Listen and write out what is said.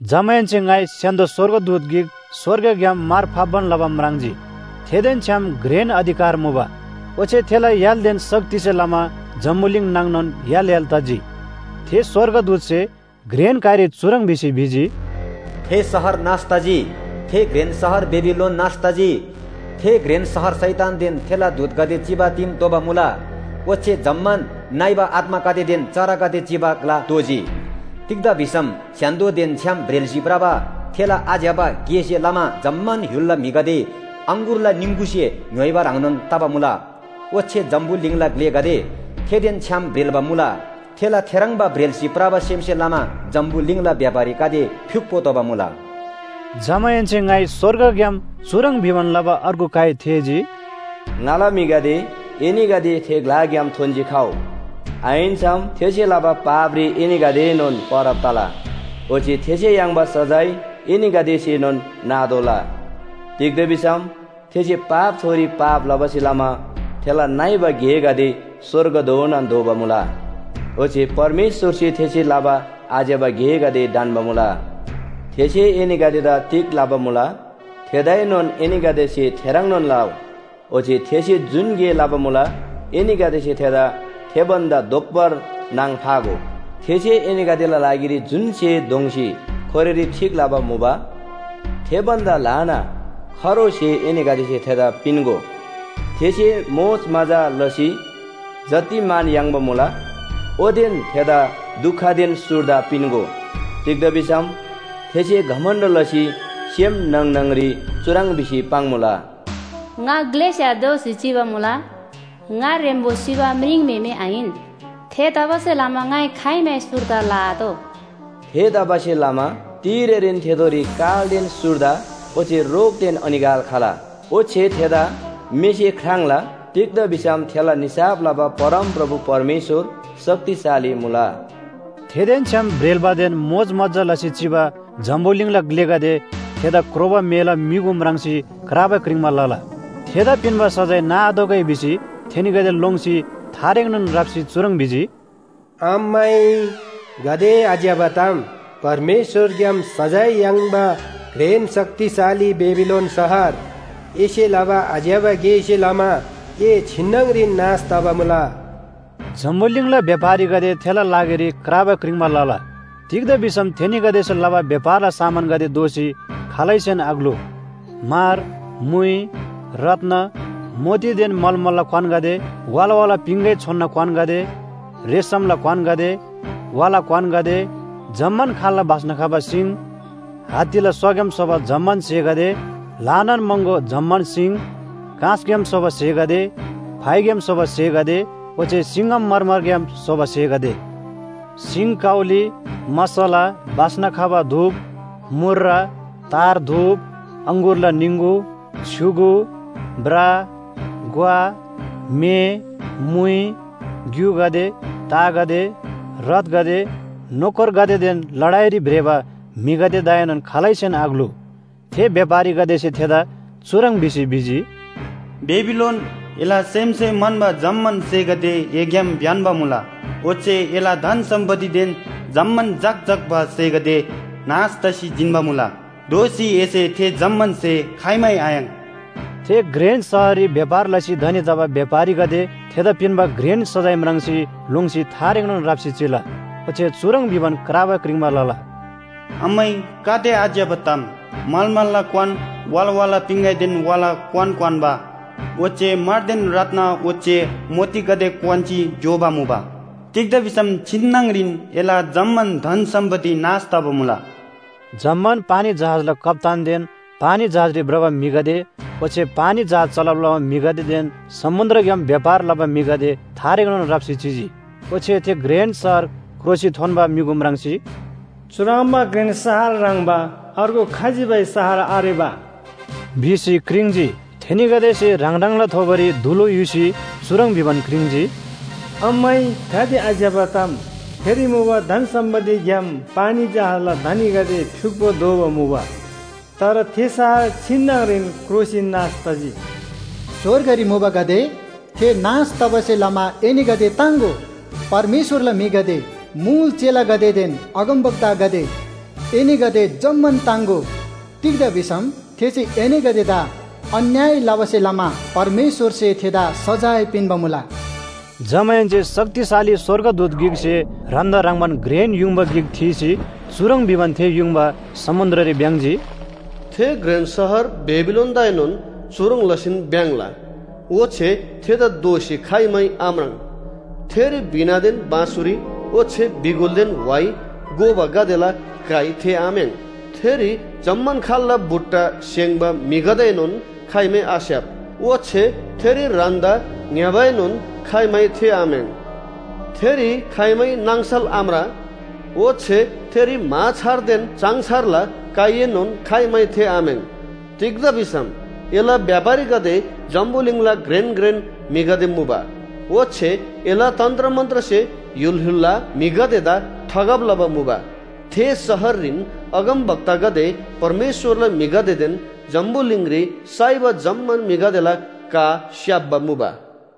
जमाहेन्‍से ङाइ स्‍य्‍हान्‍दो स्‍वर्गदूत गिक स्‍वर्गग्‍याम मार फाप्‍बान लबा म्राङ्जी। थेदेन छ्‌याम घ्रेन अधिकार मुबा। ओच्‍छे थेला य्‍हालदेन शक्तिसे लमा जम्‍बुलिङ नाङनोन य्‍हाल य्‍हाल तजी। थे स्‍वर्गदूतसे घ्रेन काइरी चुह्रङ् भिसी भिजी, “थे शहर नाश तजी! थे घ्रेन शहर बेबिलोन नाश तजी, थे घ्रेन शहर शैतानदेन थेला दूतगदे चिबा दिम दोबा मुला, ओच्‍छे जम्‍मान नइबा आत्‍मागदेदेन चरागदे चिबा ग्‍ला दोजी। तिग्‍दा भिसम स्‍य्‍हान्‍दोदेन छ्‌याम ब्रेल्‍सी भ्रबा थेला आज्‍यबा गेसे लमा जम्‍मान य्‍हुलला म्‍हिगदे अङगुरला निङगुसे ङ्‌य्‍होइबा ह्रङ्नोन तबा मुला। ओच्‍छे जम्‍बुलिङला ग्‍लेगदे थेदेन छ्‌याम ब्रेल्‍बा मुला, थेला थेह्रङ्बा ब्रेल्‍सी भ्रबा सेमसे लमा जम्‍बुलिङला व्‍यापारीगदे फ्‍युक्‍पो दोबा मुला।” जमाहेन्‍से ङाइ स्‍वर्गग्‍याम चुह्रङ् भिबान लबा अर्गु काइ थेःजी, “ङाला म्‍हिगदे, एनीगदे थे ग्‍लाग्‍याम थोन्‍सी खउ। आहिन्‍सम थेसे लबा पापरी एनीगदेएनोन परब तला, ओच्‍छे थेसे याङ्बा सजाय एनीगदेसेनोन नातोःला। तिग्‍दा भिसम थेसे पापथोरी पाप लबासे लमा थेला नइबा गेगदे स्‍वर्गधोनान धोबा मुला। ओच्‍छे परमेश्‍वरसे थेसे लबा आज्‍यबा गेगदे ढन्‍बा मुला। थेसे एनीगदेदा तिग लबा मुला, थेदाएनोन एनीगदेसे थेह्रङ्नोन लउ। ओच्‍छे थेसे जुन गे लबा मुला एनीगदेसे थेदा थे भन्‍दा दोब्‍बर नाङ फागो। थेसे एनीगदेला लागिरी जुन स्‍हे दोङ्‌सी खोरेरी ठीक लबा मुबा थे भन्‍दा ल्‍हाना खरो स्‍हे एनीगदेसे थेदा पिन्‍गो। थेसे मोजमजा लसी जति मान याङ्बा मुला, ओतेन थेदा दुखदेन सुर्दा पिन्‍गो। तिग्‍दा भिसम थेसे घमण्‍ड लसी सेम न्‍हङ न्‍हङरी चुह्रङ् भिसी पाङ्‌मुला। ‘ङा ग्‍लेस्‍या दोसी चिबा मुला, ङा ह्रेम्‍बो सिबा म्रिङम्‍हेमे आहिन। थेतबासेलमा ङाइ खाइमै सुर्दा लआतोः।’ थेतबासेलमा तिरेरीन थेथोरी कालदेन सुर्दा ओच्‍छे रोगदेन अनिकाल खला। ओच्‍छे थेदा मेसे ख्राङ्ला, तिग्‍दा भिसम थेला निसाफ लबा परमप्रभु परमेश्‍वर शक्तिशाली मुला।” थेदेन छ्‌याम ब्रेल्‍बादेन मोजमजा लसी चिबा जम्‍बुलिङला ग्‍लेगदे थेदा क्रोबा मेला म्‍युगु म्राङ्सी क्राबा क्रिङ्‌बा लला। थेदा पिन्‍बा सजाय नाआतोःगै भिसी थेनीगदे लोङ्सी थारेङनोन राप्‍सी चुह्रङ् भिजी, “अम्‍मै गाते आज्‍यबा ताम, परमेश्‍वरग्‍याम सजाय याङ्बा घ्रेन शक्तिशाली बेबिलोन शहर, एसे लबा आज्‍यबा गेसे लमा ए छिन्‍नङरीन नाश तबा मुला।” जम्‍बुलिङला व्‍यापारीगदे थेला लागिरी क्राबा क्रिङ्‌बा लला, तिग्‍दा भिसम थेनीगदेसे लबा व्‍यापारला सामानगदे दोःसी खालैसेन आग्‍लु। म्‍हर, म्‍हुइ, रत्‍न, मोतीदेन मलमलला क्‍वानगदे वाला वाला पिङगै छोनना क्‍वानगदे, रेशमला क्‍वानगदे, वाला क्‍वानगदे, जम्‍मान खाल्‍ला बास्‍ना खबा सिङ, हात्तीला स्‍वाग्‍याम स्‍होबा जम्‍मान स्‍हेगदे, ल्‍हानान महँगो जम्‍मान सिङ, काँसग्‍याम स्‍होबा स्‍हेगदे, फाइग्‍याम स्‍होबा स्‍हेगदे, ओच्‍छे सिङ्‍गमरमरग्‍याम स्‍होबा स्‍हेगदे, सिङकाउली, मसला, बास्‍ना खबा धूप, मूर्र, तार धूप, अङगुरला निङगु, छ्‌युगु, ब्रा, ग्‍वा, म्‍हे, मुइ, ग्‍युगदे, तागदे, रथगदे, नोकरगदेदेन लडाइरी भ्रेबा म्‍हिगदेदाएनोन खालैसेन आग्‍लु। थे व्‍यापारीगदेसे थेदा चुह्रङ् भिसी भिजी, “बेबिलोन, एला सेमसे म्‍हन्‍बा जम्‍मान स्‍हेगदे एग्‍याम ब्‍यन्‍बा मुला। ओच्‍छे एला धन सम्‍पत्तिदेन जम्‍मान झक्‍झक्‍बा स्‍हेगदे नाश तसी जिन्‍बा मुला। दोःसी एसे थे जम्‍मान स्‍हे खाइमै आयाङ्। थे घ्रेन शहररी व्‍यापार लसी धनी तबा व्‍यापारीगदे थेदा पिन्‍बा घ्रेन सजाय म्राङ्सी लोङ्सी थारेङनोन राप्‍सी चिला। ओच्‍छे चुह्रङ् भिबान क्राबा क्रिङ्‌बा लला, “अम्‍मै गाते आज्‍यबा ताम, मलमलला क्‍वान, वाला वाला पिङगैदेन वाला क्‍वान क्‍वान्‍बा ओच्‍छे म्‍हरदेन रत्‍न ओच्‍छे मोतीगदे क्‍वान्‍सी ज्‍योबा मुबा। तिग्‍दा भिसम छिन्‍नङरीन एला जम्‍मान धन सम्‍पत्ति नाश तबा मुला।” जम्‍मान पानी जहाजला कप्‍तानदेन पानी जहाजरी भ्रबा म्‍हिगदे ओच्‍छे पानी जहाज चलब लबा म्‍हिगदेदेन समुन्‍द्रग्‍याम व्‍यापार लबा म्‍हिगदे थारेङनोन राप्‍सी चिजी। ओच्‍छे थे घ्रेन शहर क्रोसी थोन्‍बा म्‍युगु म्राङ्सी, “चुह्रङ्बा घ्रेन शहर ह्रङ्‌बा अर्गु खजिबै शहर आरेबा” भिसी क्रिङ्‌जी। थेनीगदेसे ह्राङ ह्राङला थोबोरी धुलु युसी चुह्रङ् भिबान क्रिङ्‌जी, “अम्‍मै गाते आज्‍यबा ताम, थेरी मुबा धन सम्‍पत्तिग्‍याम पानी जहाजला धनीगदे फ्‍युक्‍पो दोबा मुबा। तर थे शहर छिन्‍नङरीन क्रोसी नाश तजी। स्‍वर्गरी मुबागदे, थे नाश तबासे लमा एनीगदे ताङ्‍गो! परमेश्‍वरला म्‍हिगदे, मुल चेलागदेदेन अगमवक्तागदे, एनीगदे जम्‍मान ताङ्‍गो। तिग्‍दा भिसम थेसे एनीगदेदा अन्‍याय लबासे लमा परमेश्‍वरसे थेदा सजाय पिन्‍बा मुला।” जमाहेन्‍से शक्तिशाली स्‍वर्गदूत गिकसे ह्रान्‍दा ह्रङ्‌बान घ्रेन युङबा गिक थीसी चुह्रङ् भिबान थे युङबा समुन्‍द्ररी भ्‍याङ्‍जी, “थे घ्रेन शहर बेबिलोनदाएनोन चुह्रङ् लसीन भ्‍याङ्‍ला, ओच्‍छे थेदा दोःसी खाइमै आम्राङ्। थेरी वीणादेन बाँसुरी ओच्‍छे बिगुलदेन व्‍हाइ गोबागदेला काइ थेःआम्‍याङ्। थेरी जम्‍मान खाल्‍ला बुट्टा स्‍हेङ्‌बा म्‍हिगदेएनोन खाइमै आस्‍याप। ओच्‍छे थेरी ह्रान्‍दा ङ्‌यबाएनोन खाइमै थेःआम्‍याङ्। थेरी खाइमै नाङसल आम्रा। ओच्‍छे थेरी म्‍हाछारदेन चाङछारला काइएनोन खाइमै थेःआम्‍याङ्। तिग्‍दा भिसम एला व्‍यापारीगदे जम्‍बुलिङला घ्रेन घ्रेन म्‍हिगदे मुबा। ओच्‍छे एला तन्‍त्रमन्‍त्रसे य्‍हुल य्‍हुलला म्‍हिगदेदा ठगब लबा मुबा। थे शहररीन अगमवक्तागदे, परमेश्‍वरला म्‍हिगदेदेन जम्‍बुलिङरी साइबा जम्‍मान म्‍हिगदेला का स्‍याप्‍बा मुबा।”